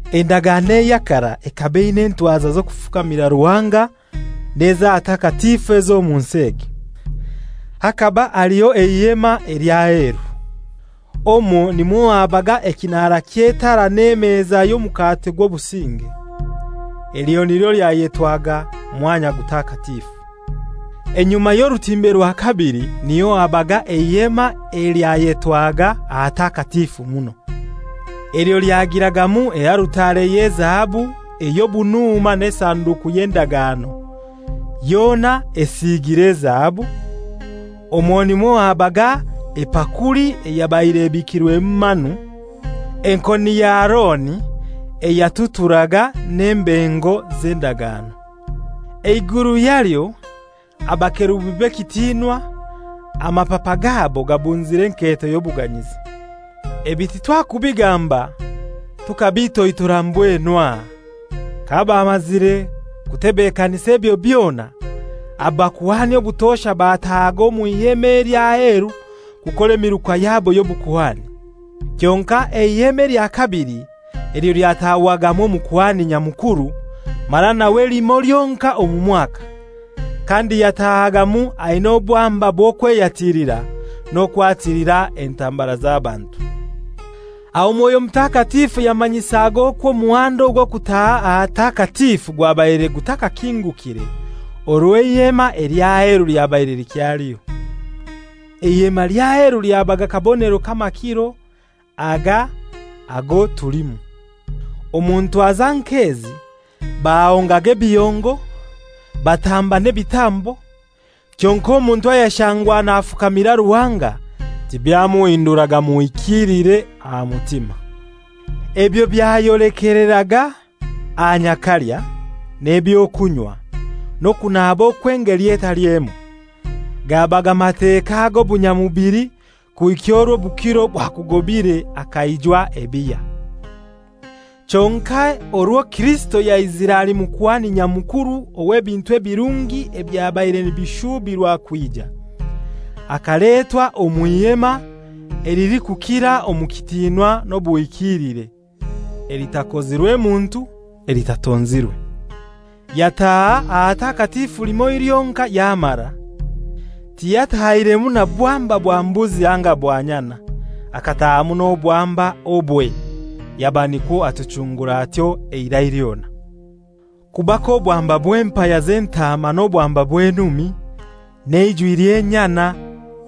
Endagano eya karai ekaba eina entwaza z'okufukamira Ruhanga n'ez'ahatakatifu ez'omu nsi egi. Hakaba haliho Eihema elikozirwe ely'aheru. Omwo nimwo habaga ekinara ky'etara n'emeza y'Omukate gw'Obusinge. Elyo nilyo lyayetwaga «Mwanya Gutakatifu.» Enyuma y'orutimbe rwa kabili niyo habaga Eihema elyayetwaga «Ahatakatifu Muno.» Elyo lyagiragamu ealutare y'ezahabu ey'obunuuma n'Esanduku y'Endagano, yona esiigire ezahabu, omwo nimwo habaga epakuli eyabaire ebikirwemu manu, enkoni ya Aroni eyatuturaga n'embengo z'endagano. Eiguru yalyo abakerubi b'ekitinwa, amapapa gabo gabunzire enketo y'obuganyizi. Ebi titwakubigamba tukabitoitora mbwenu aha. Kabamazire kutebekanisa ebyo byona, abakuhani obutosha batahaga omw'Ihema ely'aheru kukora emiruka yabo y'obukuhani. Kyonkai Eihema elya kabili elyo lyatahwagamu Omukuhani Nyamukuru, mara nawe limoi lyonkai omu mwaka, kandi yatahagamu aina obwamba bw'okweyatilira n'okwatilira entambara z'abantu. Aho Mwoyo Mutakatifu yamanyisaga okwo omuhanda ogw'okutaaha ahatakatifu gwabaire gutakakingukire orwo Eihema ely'aheru lyabaire likyaliho. (Eihema ly'aheru lyabaga kabonero k'amakiro aga ago tulimu). Omu ntwaza nk'ezi bahongaga ebihongo, batamba n'ebitambo, kyonkai omuntu ayashangwa nafukamira Ruhanga tibyamuhinduraga muhikiilire aha mutima. Ebyo byayolekeraga aha nyakalya, n'eby'okunywa, n'okunaaba okw'engeli etali emoi; gabaga Mateka ag'obunyamubili kuhika orwo obukiro bwakugobire akaijwa ebihya. Kyonkai orwo Kirisito yaizire ali Mukuhani Nyamukuru ow'ebintu ebirungi ebyabaire nibishuubirwa kwija, akaletwa omw'Ihema elilikukira omu kitinwa n'obuhikiilire (elitakozirwe muntu, elitatonzirwe). Yataaha Ahatakatifu limoi lyonkai yamara, tiyatahiremu na bwamba bwa mbuzi anga bwa nyana: akatahamu n'obwamba obwe, yaba nikwo atuchungura atyo eirai lyona. Kuba k'obwamba bw'empaya z'entaama n'obwamba bw'enumi, n'eijwi ly'enyana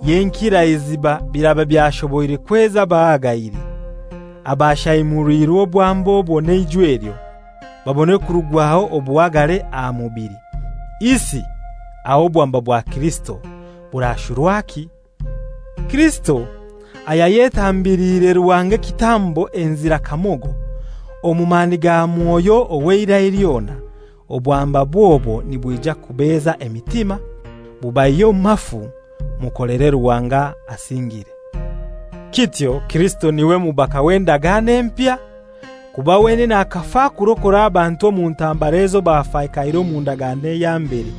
y'enkiraiziba biraba byashoboire kweza abahagaire, abashaimuliirwe obwamba obwo n'eijwi elyo, babone kurugwaho obuhagare aha mubili, isi aho obwamba bwa Kirisito burashurwaki? Kirisito ayayetambiliire Ruhanga ekitambo enzira kamogo, omu mani ga Mwoyo ow'eirai lyona! Obwambabwe obwo nibwija kubeza emitima, bubaihye omu mafu, mukolere Ruhanga asingire. Kityo Kirisito n'iwe mubaka w'endagano empya, kuba wenene akafa kurokora abantu omu ntambara ezo bafakaire omu ndagano eya mbere,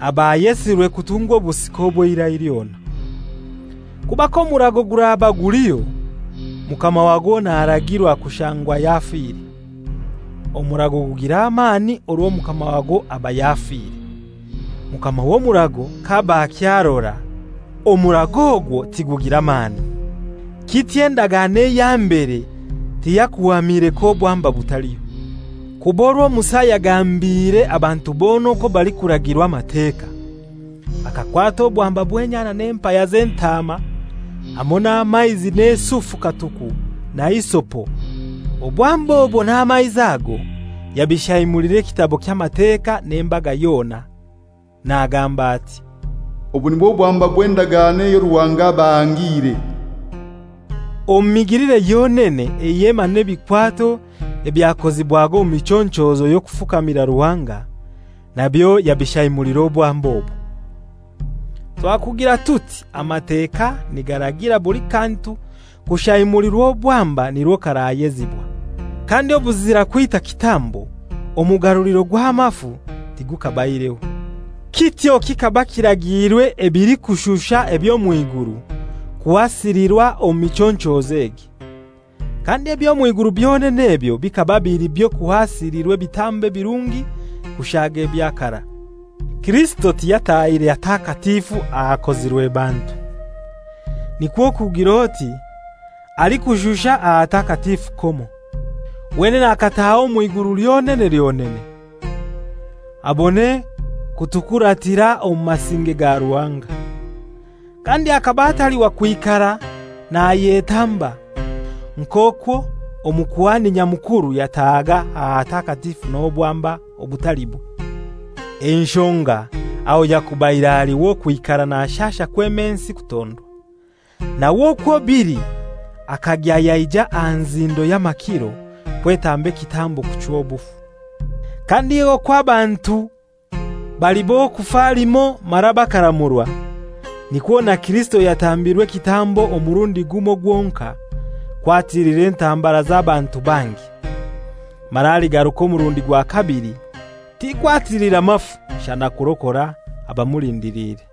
abayesirwe kutungwa obusika obw'eirai lyona. Kuba k'omurago guraba guliho, mukama wagwo naragirwa kushangwa yafire. Omurago gugira amani orwo mukama wagwo aba yafire. Mukama w'omurago k'aba akyarora, omurago ogwo tigugira mani. Kityo endagano eya mbere tiyakuhamire k'obwamba butaliho. Kuba orwo Musa yagambiire abantu bona okwo balikuragirwa Amateka, akakwata obwamba bw'enyana n'empaya z'entaama, hamoi n'amaizi n'esufu katuku na hisopo, obwamba obwo n'amaizi ago yabishaimulira ekitabo ky'Amateka n'embaga yona, nagamba ati, «Obu nibwo bwamba bw'endagano eyo Ruhanga abahangiire.» Omu migilire yonene Eihema n'ebikwato ebyakozibwaga omu michonchozo y'okufukamira Ruhanga, nabyo yabishaimulira obwamba obwo. Twakugira tuti Amateka nigaragira buli kantu kushaimulirwa obwamba nirwo karayezibwa, kandi obuzira kwita kitambo omugaruliro gw'amafu tigukabaireho. Kityo kikaba kiragiirwe ebilikushusha eby'omw'iguru kuhasilirwa omu michonchozo egi, kandi eby'omw'iguru byonene ebyo bikaba bili by'okuhasilirwa ebitambo ebirungi kushaaga ebya karai. Kirisito tiyatahire hatakatifu ahakozirwe bantu, nikwo kugir'oti ahalikushusha ahatakatifu komo. Wenene akataaha omw'iguru lyonene lyonene, abone kutukuratira omu masinge ga Ruhanga. Kandi akaba atali wa kwikara nayetamba, nk'okwo Omukuhani Nyamukuru yatahaga ahatakatifu n'obwamba obutalibwe. Enshonga aho yakubaire ali w'okwikara nashasha kwema ensi kutondwa. Nawe okwo bili akagya yaija aha nzindo y'amakiro kwetamba ekitambo kuchwa obufu. Kandi okwo abantu bali b'okufa limoi mara bakaramurwa, nikwo na Kirisito yatambirwe ekitambo omurundi gumoi gwonkai, kwatilira entambara z'abantu bangi. Mara aligaruka omurundi gwa kabili, ti kwatilira mafu shana kurokora abamulindiliire.